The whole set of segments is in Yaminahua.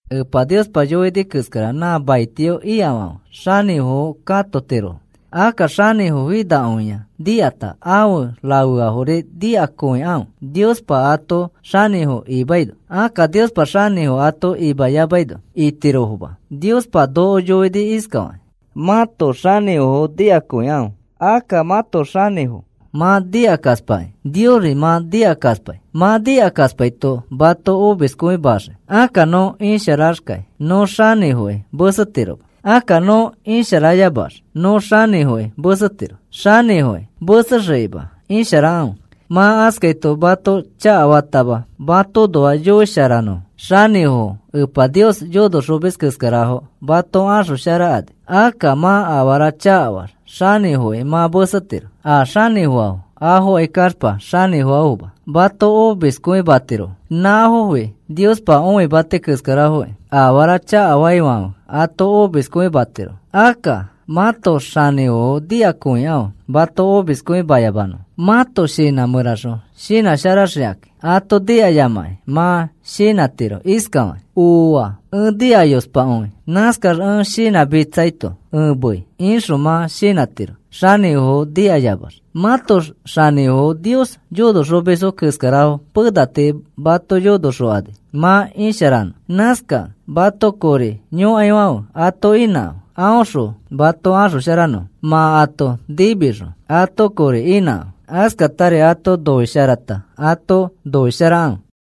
Epa Niospa yoini keskara nã maitio ikafãfe xanĩfofo katotirofo. Akka xanĩfo finakõia nikata afe rafeafori nikakõikãfe Niospa ato xanĩfo imaino. Akka Niospa xanĩfo ato imayamaino itirofoma. Niospa noko yoini iskafakĩ: “Mãto xanĩfofo nikakõikãfe.” Akka mãto xanĩfo mã nikakaspakĩ Niosri mã nikakaspai. Mã nikakaspaito mato omiskõimaxii. Akka nõ isharaxkai nõ xanĩfoki mesetiroma. Akka nõ isharayamax nõ xanĩfoki mesetiro. Xanĩfoki mesexikima isharakãfe. Mã askaito mato chakafatama matoõnoa yoisharanõfo. Xanĩfofo Epa Nios yonoxomis keskarafo mato axosharakani. Akka mã afara chakafaax xanĩfoki mã mesetiro. A xanĩfoafo afokai kaxpa xanĩfoafoma, mato omiskõimatirofo. Nãfofi Niospa õimati keskarafokĩ afara chakafaifãfe ato omiskõimatirofo. Akka mãto xanĩfofo nikakõikãfe mato omiskõimayamanõfo. Mãto shinã mẽraxõ shinãsharaxikakĩ. Ato nikayamakĩ mã shinãtiro iskafakĩ: “Ooa, ẽ nikayospakõi. Nãskax ẽ shinãmitsaito ẽ mei,” ixõ mã shinãtiro xanĩfofo nikayamax. Mãto xanĩfofo Nios yonoxomisfo keskarafo pena tii mato yonoxokani mã isharanõ. Nãskakẽ mato kori yõkaifãfe ato inãkãfe aõxõ mato axosharanõfo. Mã ato nimixõ ato kori inãkãfe. Askatari ato noisharata ato noisharakãfe.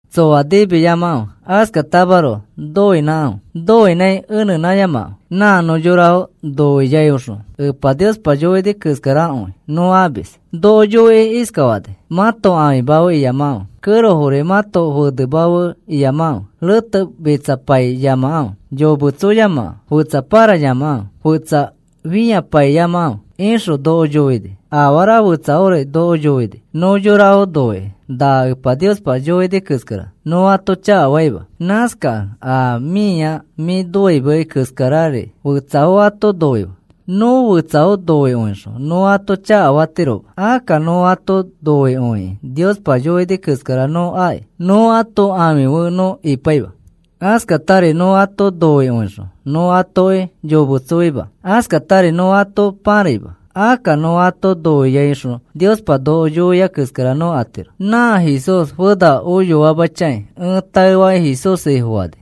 Tsoa nimiyamakãfe. Askatamaroko noinãkãfe. Noinãi eneyamakãfe. Nã nõ yorafo noiaiõxõ Epa Niospa yoini keskarakõi nõ amis. Noko yoikĩ iskafani: “Mãto ãfima fe iyamakãfe. Kẽrofori mãto fenema feri iyamakãfe. Retemitsapaiyamakãfe. Yometsoyamakãfe. Fetsa pãrayamakãfe. Fetsa fĩapaiyamakãfe,” ixõ noko yoini. Afara fetsafori noko yoini. Nõ yorafo noikĩ na Epa Niospa yoini keskara nõ ato chakafaima. Nãskakẽ a mĩa mĩ noimei keskari akĩ fetsafo ato noife. Nõ fetsafo noikõixõ nõ ato chakafatiroma. Akka nõ ato noikõikĩ Niospa yoini keskara nõ aki. Nõ ãto ãfi fe nõ ipaima. Askatari nõ ato noikõixõ nõ atoki yometsoima. Askatari nõ ato pãraima. Akka nõ ato noiaiõxõ Niospa noko yoia keskara nõ atiro. Nã Jesús fena oyoaima chãi ẽ taefakĩ Jesús Ifofani.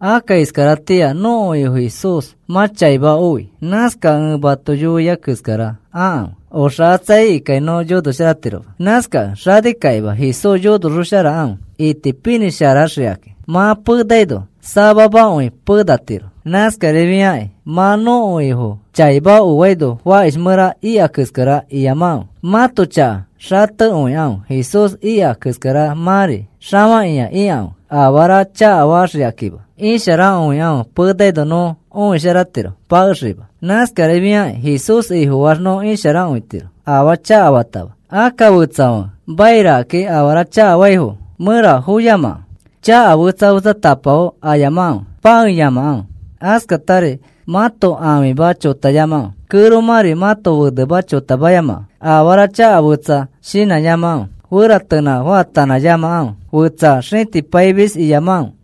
Akka iskaratĩa nõko Ifo Jesús mã chaima oi. Nãskakẽ ẽ mato yoiai keskara akãfe. Oxakatsa ikai keskara iyamakãfe. Oxakatsa ikĩkai nõ yonosharatiroma. Nãskakẽ xanikakĩma Jesús yonosharaxokãfe itipinĩsharaxikakĩ. Mã penaino samamakõi penatiro. Nãskarifiakakĩ mã nõko Ifo chaima oaino fakish mẽra ika keskara iyamakãfe. Mãto chaka xatekõikãfe. Jesús ika keskara mãri xafakĩa ikãfe afara chakafaxikakima. Isharakõikãfe penano nõ õisharatiro pakexikima. Nãskarifiakĩ Jesús Ifofaax nõ isharakõitiro afaa chakafatama. Akka fetsafãfe monokakĩ afara chakafaifo mẽra foyamakãfe. Chaka fetsa fetsatapafo ayamakãfe. Pãeyamakãfe. Askatari mãto ãfima chotayamakãfe. Kẽromãri mãto fenema chotamayamakãfe. Afara chaka fetsafo shinãyamakãfe. Feratenã faatanãyamakãfe. Fetsa xĩtipaimis iyamakãfe.